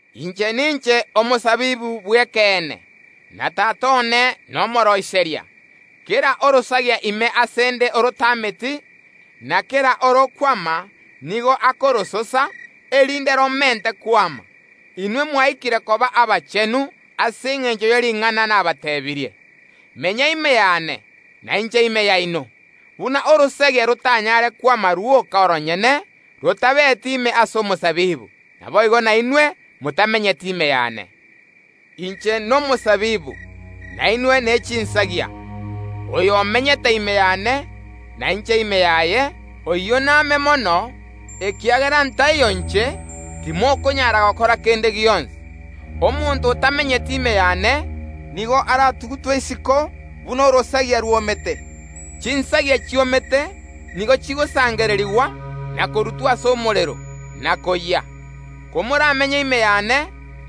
“Inche ninche omosabibu bw’ekeene, na Tata one nomooroiseria. Kera orosagia ime ase ’nde orotameti, nigo akoronacha, na kera orokwama nigo akorososa, erinde romente kwama. Inwe mwaikire koba abachenu ase engencho ye ring’ana nabateebirie. Menya ime yane, na inche ime yaino. Buna orosagia rotanyare kwama rwoka oronyene, rotabeti ime ase omosabibu, naboigo nainwe motamenyeti ime yane. Inche nomosabibu, na inwe nechinsagia. Oyo omenyete ime yane, na inche ime yaye, oyio name mono, ekiagera ntaiyo inche, timokonyara gokora kende gionsi. Omonto otamenyeti ime yane, nigo aratugutwe isiko buna orosagia rwomete. Chinsagia chiomete nigo chigosangererigwa, na korutwa ase omorero, na koyia. Komoramenye ime yane,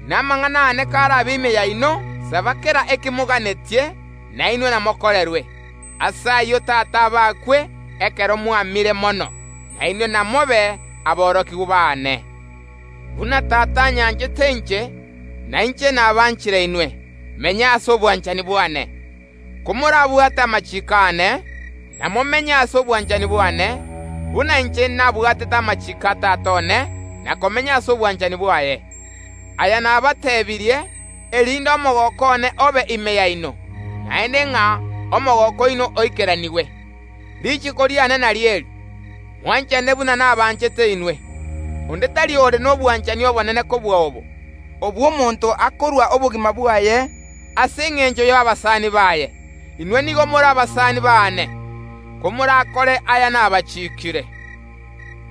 na amang’ana aane karabe ime yaino, saba kera ekemoganetie na inwe namokorerwe. Ase ayio Tata abakwe ekero mwamire mono; na inwe namobe aborokigwa baane. Buna Tata anyanchete inche, na inche nabanchire inwe, menya ase obwanchani bwane. Komorabwate amachiiko aane, namomenye ase obwanchani bwane, buna inche nabwatete amachiiko a Tata one na komenya ase obwanchani bwaye. Aya nabateebirie, erinde omogooko one obe ime yaino, naende ng’a omogooko oino oikeranigwe. “Richiko riane nario eri: Mwanchane buna nabanchete inwe. Onde tari ore nobwanchani obonene kobua obo, obw’omonto akorua obogima bwaye ase engencho y’abasani baye. Inwe nigo more abasani baane, komorakore aya nabachiikire.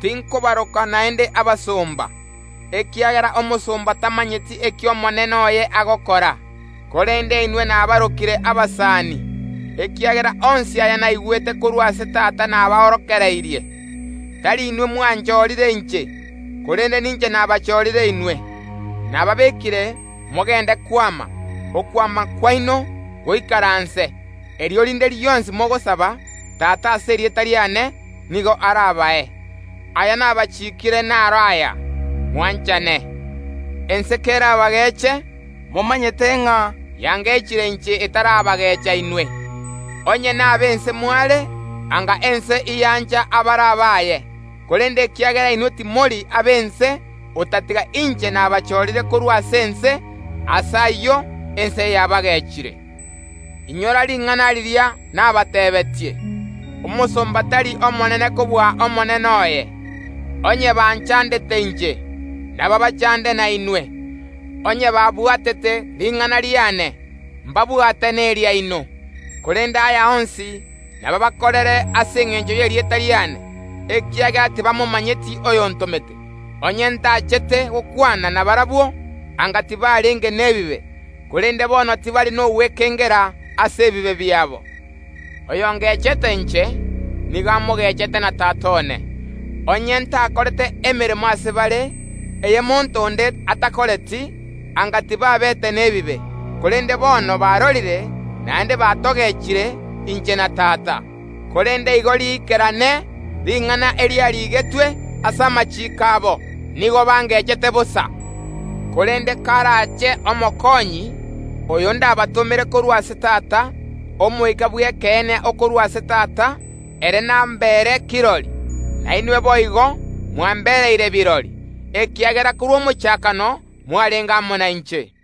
Tinkobaroka naende abasomba, ekiagera omosomba tamanyeti eki omonene oye agokora; korende inwe nabarokire abasani, ekiagera onsi aya naigwete korwa ase Tata nabaorokeirie. Tari inwe mwanchorire inche, korende ninche nabachorire inwe, nababekire mogende kwama, okwama kwaino goikaranse; erio rinde rionsi mogosaba Tata ase erieta riane, nigo arabae. “Aya nabachiikire naro aya: mwanchane. Ense kerabageche, momanyete ng’a yangechire inche etarabagecha inwe. Onye nab’ense mware, anga ense ’yancha abare abaye, korende ekiagera inwe timori ab’ense, otatiga inche nabachorire korwa ase ense, ase ayio ense yabagechire. Inyora ring’ana riria nabateebeetie: Omosomba tari omonene kobua omonene oye. Onye banchandete inche, nabaabachande nainwe; onye babwatete ring’ana riane nabwate neriaino. Korende aya onsi nabaabakorere ase engencho y’erieta riane, ekiagera tibamomanyeti oyontomete. Onye ntachete gokwana nabarabwo, anga tibarenge nebibe, korende bono tibari nogwekengera ase ebibe biabo. Oyongechete inche, nigo amogechete na Tata one. Onye ntakorete emeremo ase bare eye monto onde atakoreti, anga tibabete nebibe, korende bono barorire, naende batogechire inche na Tata. Korende igo riikerane ring’ana eriarigetwe ase amachiiko abo: Nigo bangechete bosa. Korende karache Omokonyi, oyo ndabatomere korwa ase Tata, Omoika bw’Ekeene okorwa ase Tata, ere nambere kirori. Na inwe boigo mwambereire birori, ekiagera korwa omochakano mwarenge amo nainche.